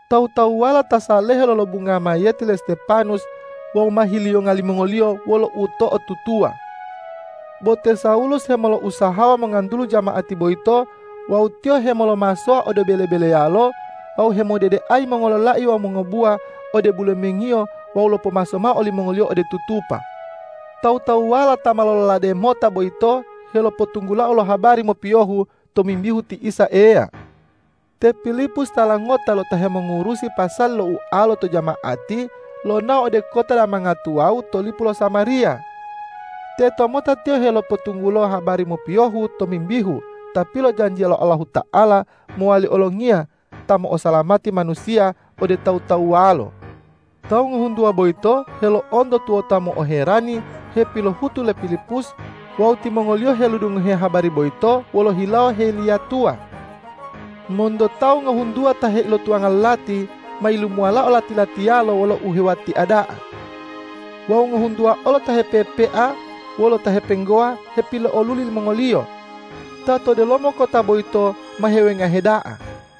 Tawu-tawuwala ta salehe lolobungao mayiyeti le Stepanus wawu ma hiliyonga limongoliyo wolo uto'otutuwa. Bo te Sawulus hemolousahawa mongantulu jama'ati boyito wawu tiyo hemolomasowa ode bele-beleyalo wawu hemodedeayi mongololai wawu mongobuwa ode bulemengiyo wawu lopomaso mao olimongoliyo ode tutupa. Tawu-tawuwala ta ma lololade mota boyito helopotunggulao lo habari mopiyohu tomimbihu ti Isa Eya. Te Pilipus tala ngota lo ta hemongurusi pasali lo ualo to jama'ati, lonao ode kota damanga tuwawu to lipu lo Samariya. Tetomota tiyo helopotunggulo habari mopiyohu tomimbihu Ta pilojanjiya lo Allahuta'ala mowali Olongiya ta mo'osalamati manusiya ode tawu-tawuwalo. Tawu ngohuntuwa boyito helo'onto tuwota mo'oherani hepilohutu le Pilipus wawu timongoliyo helodungohe habari boyito wolo hilawo heliyatuwa. Monto tawu ngohuntuwa ta heilotuwanga lo lati, ma yilumuwalao lati-latiyalo wolo uhewuwatia da'a. Wawu ngohuntuwa olo ta hepepea wolo ta hepenggowa hepilo'oluli limongoliyo. Ta to delomo kota boyito ma hewengahe da'a.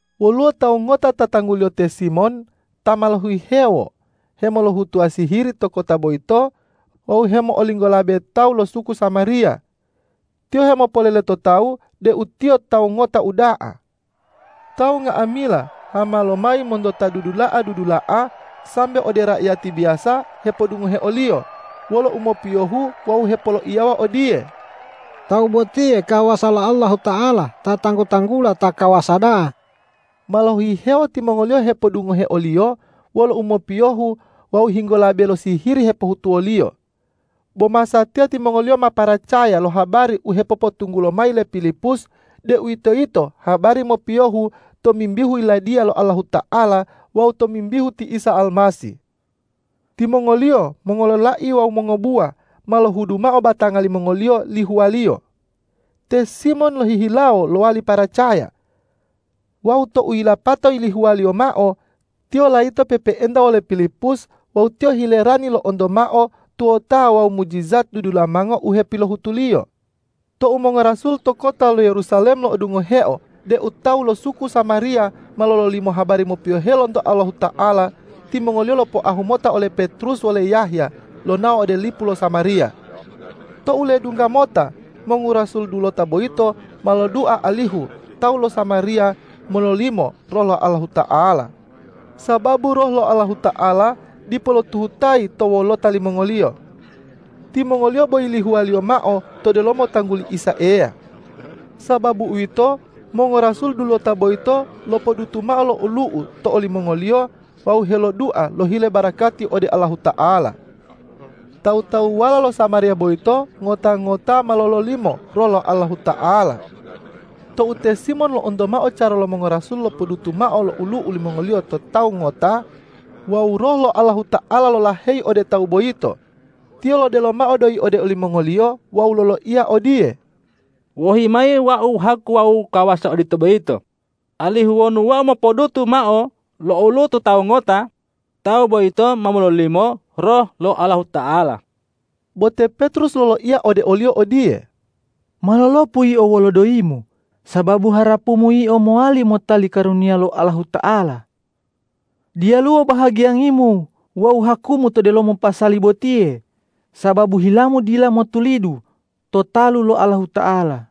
Woluwo tawu ngota ta tangguliyo te Simon ta ma lohihewo hemolohutuwa sihiri to kota boyito wawu hemo'olinggolabe tawu lo suku Samariya. Tiyo hemopolele to tawu deu tiyo tawu ngota uda'a. Tawu nga'amila hama lomayi monto ta dudula'a-dudula'a sambe ode raiyati biyasa hepodungohe oliyo wolo umopiyohu wawu hepoloiyawa odiye,”Tawu botiye kawasa lo Allahuta'ala ta tanggu-tanggula Ta Kawasa Da'a.” Ma lohihewo timongoliyo hepodungohe oliyo wolo umopiyohu wawu helinggolabe lo sihiri hepohutuwoliyo. Bo masatiya timongoliyo ma paracaya lo habari u hepopotunggulo mayi le Pilipus, deuwitoyito habari mopiyohu tomimbihu Yiladiya lo Allahuta'ala wawu tomimbihu ti Isa Almasih. Timongoliyo mongololai wawu mongobuwa ma lohudu mao batanga limongoliyo lihuwaliyo. Te Simon lohihilawo lowali paracaya. Wawu tou yilapato yilihuwaliyo mao, tiyo layito pe'epe'enta wole Pilipus wawu tiyo hilerani lo'onto mao tuwota wawu mujijat dudulamango u hepilohutuliyo. Tou mongorasul to kota lo Yerusalem lo'odungoheo deu tawu lo suku Samariya ma lololimo habari mopiyohe lonto Allahuta'ala, timongoliyo lopoahu mota ole Petrus wole Yahya lonao ode lipu lo Samariya. Tou ledungga mota, mongorasul dulota boyito ma lodua alihu tawu lo Samariya mololimo Roh lo Allahuta'ala, sababu Roh lo Allahuta'ala dipo lotuhutayi to wolota limongoliyo. Timongoliyo bo yilihuwaliyo mao to delomo tangguli Isa Eya. Sababu uwito, mongorasul dulota boyito lopodutu mao lo olu'u to olimongoliyo wawu helodua lohile barakati ode Allahuta'ala. Tawu-tawuwala lo Samariya boyito ngota-ngota ma lololimo Roh lo Allahuta'ala. Tou te Simon lo'onto mao cara lo mongorasul lopodutu mao lo olu'u limongoliyo to tawu ngota wawu Roh lo Allahuta'ala lolaheyi ode tawu boyito, tiyo lodelo mao doyi ode olimongoliyo wawu loloiya odiye,”Wohi mayi wau haku wawu kawasa odito boyito, alihu wonu wau mopodutu mao lo olu'u to tawu ngota, tawu boyito ma mololimo Roh lo Allahuta'ala.” Bo te Petrus loloiya ode oliyo odiye,”Ma lolopu yio wolo doyimu, sababu harapumu yio mowali motali karuniya lo Allahuta'ala. Diyaluwo bahagiyangimu wawu hakumu to delomo pasali botiye, sababu hilamu dila motulidu to talu lo Allahuta'ala.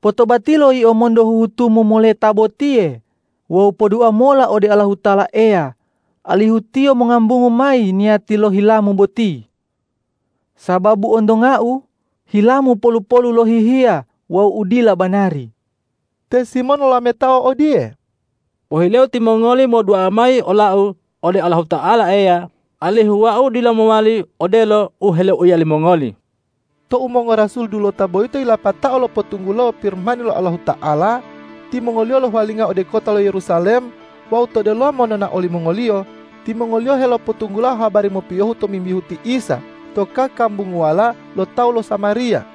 Potobatilo yio monto huhutumu moleta botiye wawu podua mola ode Allahuta'ala Eya alihu Tiyo mongambungu mayi niyati lo hilamu boti! Sababu ontongau, hilamu polu-polu lo hihiya wawu u dila banari.” Te Simon lolametao odiye,”Pohileu timongoli modua mayi olau ode Allahuta'ala Eya alihu wau dila mowali odelo u heloiya limongoli.” Tou mongorasul dulota boyito yilapatao lopotunggulo Pirimani lo Allahuta'ala, timongoliyo lohuwalinga ode kota lo Yerusalem wawu to delomo nonao limongoliyo timongoliyo helopotunggulo habari mopiyohu tomimbihu ti Isa to kakambunguwala lo tawu lo Samariya.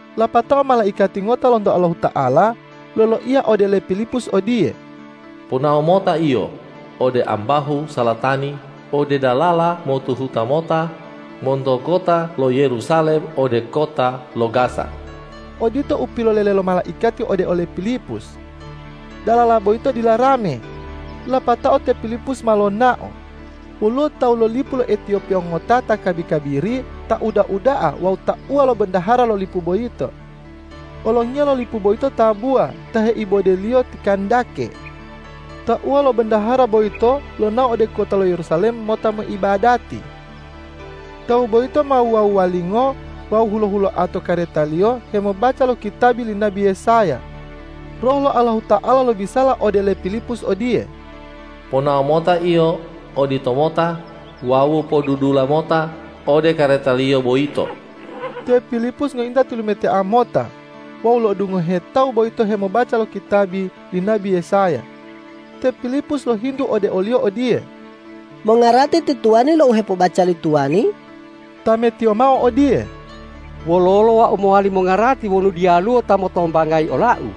Lapatao malaikati ngota lonto Allahuta'ala loloiya ode le Pilipus odiye,”Ponao mota yio ode ambahu salatani ode dalala motuhuta mota monto kota lo Yerusalem ode kota lo Gaza.” Odito u pilolele lo malaikati ode ole Pilipus. Dalala boyito dila rame. Lapatao te Pilipus ma lonao. Woluwo tawu lo lipu lo Etiyopiya ngota ta kabi-kabiri, ta uda-uda'a wawu tauwa lo bondahara lo lipu boyito. Olongiya lo lipu boyito tabuwa ta heibodeliyo ti Kandake. Tauwa lo bondahara boiyto lonao ode kota lo Yerusalem mota moibadati. Tawu boyito ma wuwa-wuwalingo wawu hulo-huloa to karetaliyo hemobaca lo kitabi li nabi Yesaya. Roh lo Allahuta'ala lobisala ode le Pilipus odiye,”Ponao mota yio oditomota wawu podudula mota ode karetaliyo boyito!” Te Pilipus ngointa tilumetea mota wawu lo'odungohe tawu boyito hemobaca lo kitabi li nabi Yesaya. Te Pilipus lohintu ode oliyo odiye,”Mongarati ti tuwani lo u hepobaca li tuwani?” Tametiyo mao odiye,”Wololo wau mowali mongarati wonu diyaluwo ta motombangayi olau?”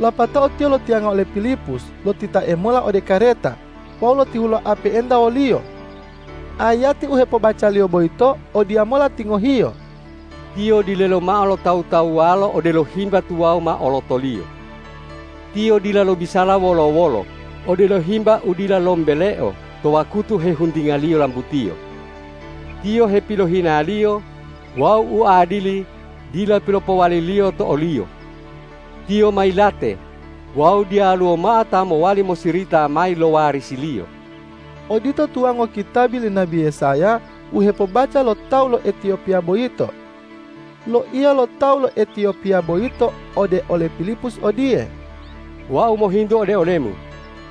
Lapatao tiyo lotiyanga ole Pilipus lotitae mola ode kareta wawu lotihuloa pe'enta woliyo. Ayati u hepobacaliyo boyito odiyamola tingohiyo,”Tiyo dilelo mao lo tawu-tawuwalo odelo himba tuwawu mao olotoliyo. Tiyo dila lobisala wolo-wolo odelo himba u dila lombeleo to wakutu hehuntingaliyo lambutiyo. Tiyo hepilohinaliyo wawu uadili dila pilopowaliliyo to o-Liyo. Tiyo ma yilate wawu diyaluwo mao ta mowali mosirita mayi lo warisi-Liyo.” Odito tuwango kitabi li nabi Yesaya u hepobaca lo tawu lo Etiyopiya boyito. Loiya lo tawu lo Etiyopiya boyito ode ole Pilipus odiye,”Wau mohintu ode olemu,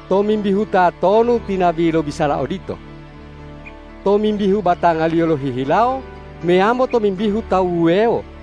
tomimbihu tatonu ti nabi lobisala odito? Tomimbihu batangaliyo lohihilawo meyambo tomimbihu tawu wuwewo?”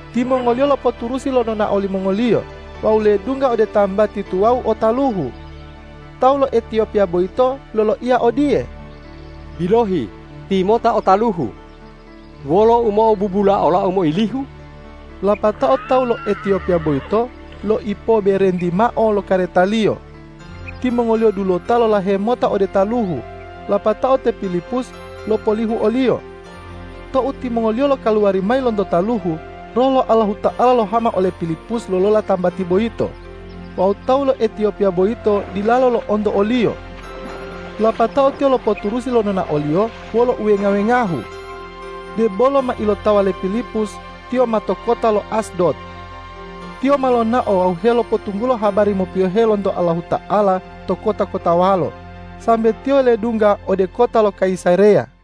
Timongoliyo lopoturusi lo nonao limongoliyo wawu ledungga ode tambati tuwawu o taluhu. Tawu lo Etiyopiya boyito loloiya odiye,”Bilohi, timota o taluhu! Wolo u mo'obubula olau meilihu?” Lapatao tawu lo Etiyopiya boyito loipoberenti mao lo karetaliyo. Timongoliyo dulota lolahe mota ode taluhu, lapatao te Pilipus lopolihu oliyo. Tou timongoliyo lokaluwari mayi lonto taluhu, Roh lo Allahuta'ala lohama ole Pilipus lolola tambati boyito wawu tawu lo Etiyopiya boyito dilalo lo'onto oliyo. Lapatao tiyo lopoturusi lo nonaoliyo wolo uwenga-wengahu. Debolo ma ilotawa le Pilipus, tiyo ma to kota lo Asdod. Tiyo ma lonao wawu helopotunggulo habari mopiyohe lonto Allahuta'ala to kota-kotawalo, sambe tiyo ledungga ode kota lo Kayisareya.